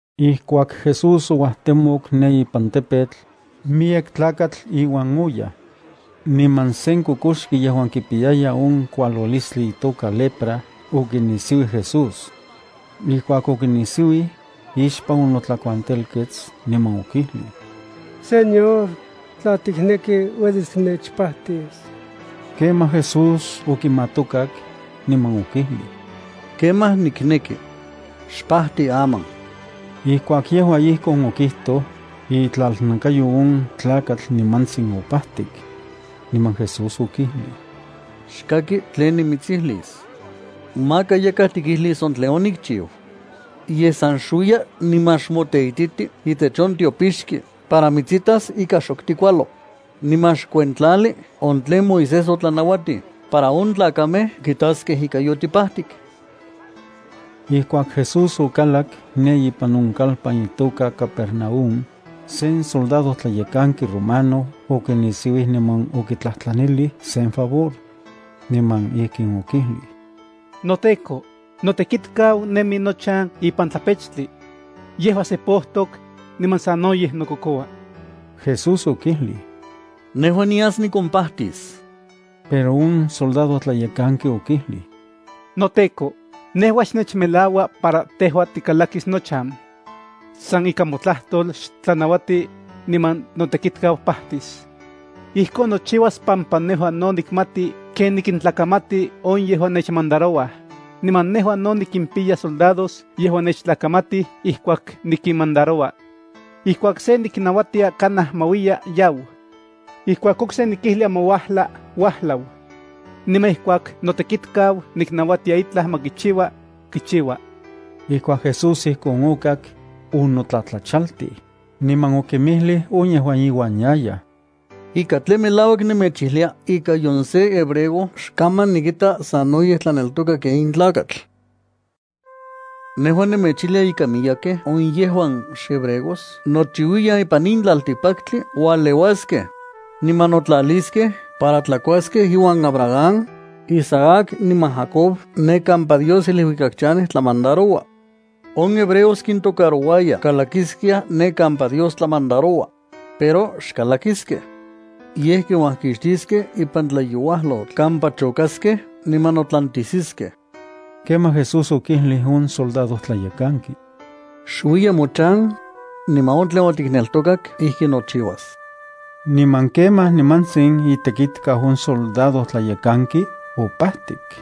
Ijkuak Jesús ouajtemok ne ipan tepetl, miyek tlakatl iuan oyaj. Niman sen kokoxki yejuan kipiyaya on kualolistli itoka lepra okinisiuij Jesús. Ijkuak okinisiuij, ixpan onotlakuantelkets, niman okijlij: —Señor, tla tikneki, uelis tinechpajtis. Kemaj Jesús okimatokak, niman okijlij: —Kemaj, nikneki. Xpajti aman. Ijkuak yejua ijkon okijtoj, itlalnakayo on tlakatl nimantsin opajtik. Niman Jesús okijlij: —Xkaki tlen nimitsijlis. Maka yakaj tikijlis on tlen onikchiu. Yej san xuiya niman xmoteititi itech on tiopixki para mitsitas ika xok tikualo, niman xkuentlali on tlen Moisés otlanauatij para on tlakamej kitaskej ika yotipajtik. Ijkuak Jesús okalak ne ipan on kalpan itoka Capernaúm, sen soldadojtlayekanki romano okinisiuij niman okitlajtlanilij sen favor. Niman ijkin okijlij: —NoTEKO, notekitkau nemi nochan ipan tlapechtli. Yejua sepojtok, niman sanoyej nokokoua. Jesús okijlij: —Nejua nias nikompajtis. Pero on soldadojtlayekanki okijlij: —NoTEKO, nejua xnechmelaua para tejua tikalakis nochan. San ikan motlajtol xtlanauati, niman notekitkau pajtis. Ijkon nochiuas pampa nejua no nikmati ken nikintlakamati on yejuan nechmandarouaj, niman nejua no nikimpiya soldados yejuan nechtlakamatij ijkuak nikinmandaroua. Ijkuak se niknauatia kanaj ma uiya, yau. Ijkuak okse nikijlia ma uajla, uajlau. Niman ijkuak notekitkau niknauatia itlaj ma kichiua, kichiua. Ijkuak Jesús ijkon okak, onotlatlachaltij, niman okinmijlij on yejuan iuan yayaj: —Ika tlen melauak nemechijlia ika nion sen hebreo xkaman nikita sanoyej tlaneltoka ken in tlakatl. Nejua nemechijlia ika miyekej on yejuan xhebreos nochiuiyan ipan in tlaltikpaktli ualeuaskej, niman notlaliskej para tlakuaskej iuan Abraham, Isaac niman Jacob ne kampa Dios iluikak chanej tlamandaroua. On hebreos kintokarouaya kalakiskiaj ne kampa Dios tlamandaroua, pero xkalakiskej. Yej kinuajxiniskej ipan tlayouajlotl kampa chokaskej niman notlantisiskej. Kemaj Jesús okijlij on soldadojtlayekanki: —Xuiya mochan, niman on tlen otikneltokak ijki nochiuas. Niman kemaj nimantsin itekitkau on soldadojtlayekanki opajtik.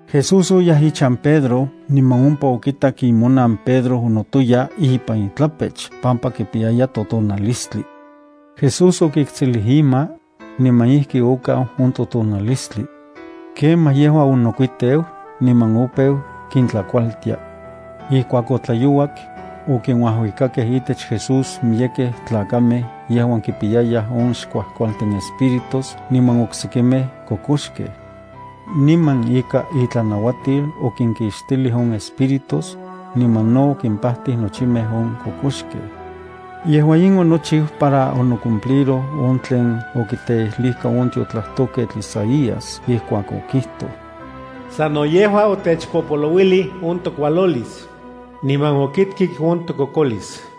Jesús oyaj ichan Pedro, niman ompa okitak imonan Pedro onotoya ipan itlapech pampa kipiyaya totonalistli. Jesús okiktsilij ima, niman ijki okau on totonalistli. Kemaj yejua onokuiteu niman opeu kintlakualtia. Ijkuak otlayouak, okinuajuikakej itech Jesús miyekej tlakamej yejuan kipiyayaj on xkuajkualtin espíritus niman oksekimej kokoxkej. Niman ikan itlanauatil okinkixtilij on espíritus, niman no okimpajtij nochimej on kokoxkej. Yejua in onochiu para onocumpliroj on tlen okiteijlijka on tiotlajtojketl Isaías ijkuak okijtoj: “Sano yejua otechpopolouilij on tokualolis, niman okitkik on tokokolis.”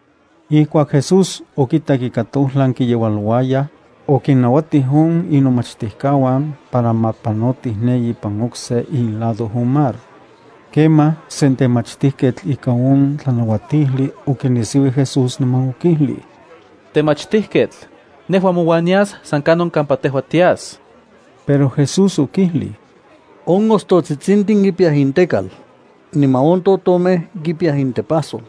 Ijkuak Jesús okitak ika tojlan kiyeualouayaj, okinnauatij on inomachtijkauan para ma panotij ne ipan okse ilado on mar. Kemaj, sen temachtijketl ika on tlanauatijli okinisiuij Jesús niman okijlij: —Temachtijketl, nejua mouan nias san kanon kampa tejua tias. Pero Jesús okijlij: —On ostotsitsintin kipiyaj intekal, niman on totomej kipiyaj intepajsol,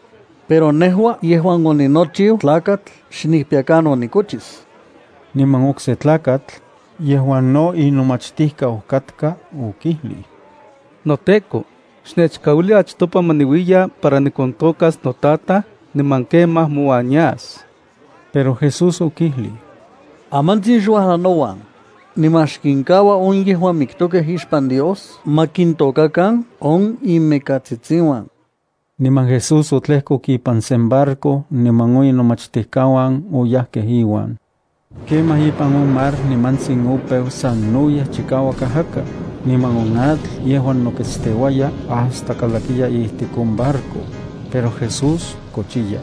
pero nejua yejuan oninochiu Tlakatl xnikpiya kanon nikochis. Niman okse tlakatl, yejuan no inomachtijkau, okijlij: —NoTEKO, xnechkauili achtopa ma niuiya para nikontokas notataj niman kemaj mouan nias. Pero Jesús okijlij: —Amantsin xuajla nouan, niman xkinkaua on yejuan miktokej ixpan Dios ma kintôkakan on inmikatsitsiuan. Niman Jesús otlejkok ipan sen barco niman on inomachtijkauan oyajkej iuan. Kemaj ipan on mar nimantsin opeu sanoyej chikauak ajaka, niman on atl yejuan noketsteuaya hasta kalakiya ijtik on barco. Pero Jesús kochiya.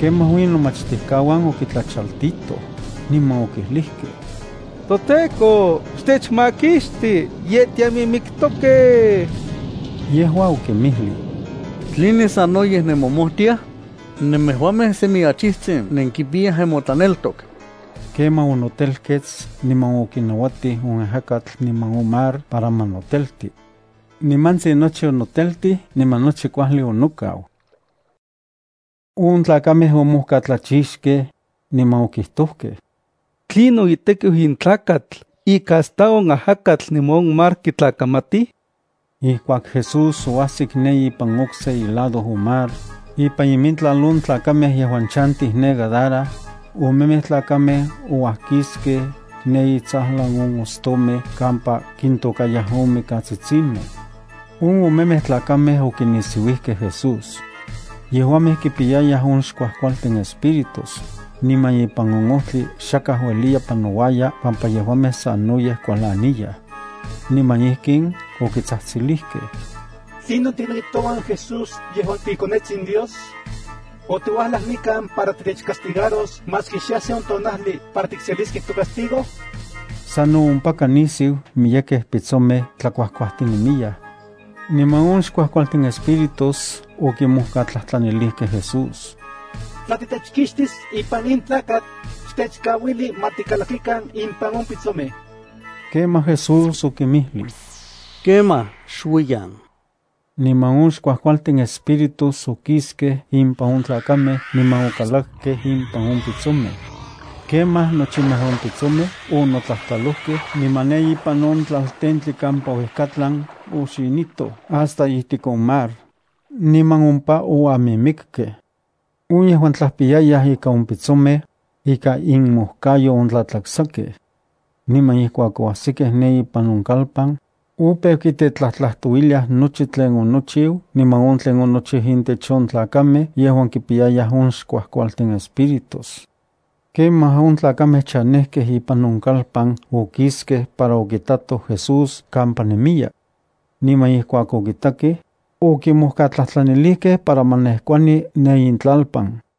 Kemaj on inomachtijkauan okitlachaltitoj, niman okijlijkej: —¡ToTEKO, xtechmakixti! ¡Ye tiamimiktokej! Yejua okinmijlij: —¿Tline sanoyej nemomojtiaj? ¡Nemejuamej semi achijtsin nenkipiyaj nenmotlaneltok! Kemaj onotelkets niman okinauatij on ajakatl niman on mar para ma notelti. Nimantsin nochi onoteltij niman nochi kuajli onokau. On tlakamej omojkatlachixkej, niman okijtojkej: —¿Tlinon itekiu in tlakatl ika hasta on ajakatl niman on mar kitlakamatij? Ijkuak Jesús oajsik ne ipan okse ilado on mar, ipan imintlal on tlakamej yejuan chantij ne Gadara, omemej tlakamej ouajkiskej ne intsajlan on ostomej kampa kintôkayaj on mikatsitsimej. On omemej tlakamej okinisiuijkej Jesús. Yejuamej kipiyayaj on xkuajkualtin espíritus, niman ipan on ojtli xakaj ueliya panouaya pampa yejuamej sanoyej kualaniyaj. Niman ijkin okitsajtsilijkej: —¿Tlinon tikneki touan Jesús tejua iKonetsin Dios? ¿Otiuajlaj nikan para titechcastigaros maski xe ajsi on tonajli para tikseliskej tocastigo? Sano ompaka nisiu miyekej pitsomej tlakuajkuajtinemiyaj. Niman on xkuajkualtin espíritus okimojkatlajtlanilijkej Jesús: —Tla titechkixtis ipan in tlakamej, xtechkauili ma tikalakikan impan on pitsomej. Kemaj Jesús okinmijlij: —Kemaj, xuiyan. Niman on xkuajkualtin espíritus okiskej impan on tlakamej niman okalakkej impan on pitsomej. Kemaj nochimej on pitsomej onotlajtlalojkej niman ne ipan on tlaltentli kampa uejkatlan oxinitoj hasta ijtik on mar, niman ompa oamimikkej. On yejuan tlajpiyayaj ika on pitsomej, ikan inmojkayo ontlatlaksakej. Niman ijkuak oajsikej ne ipan on kalpan, opeu kitetlajtlajtouiliaj nochi tlen onochiu, niman on tlen onochiu intech on tlakamej yejuan kipiyayaj on xkuajkualtin espíritus. Kemaj on tlakamej chanejkej ipan on kalpan okiskej para okitatoj Jesús kampa nemiya. Niman ijkuak okitakej, okimojkatlajtlanilijkej para ma nejkuani ne intlalpan.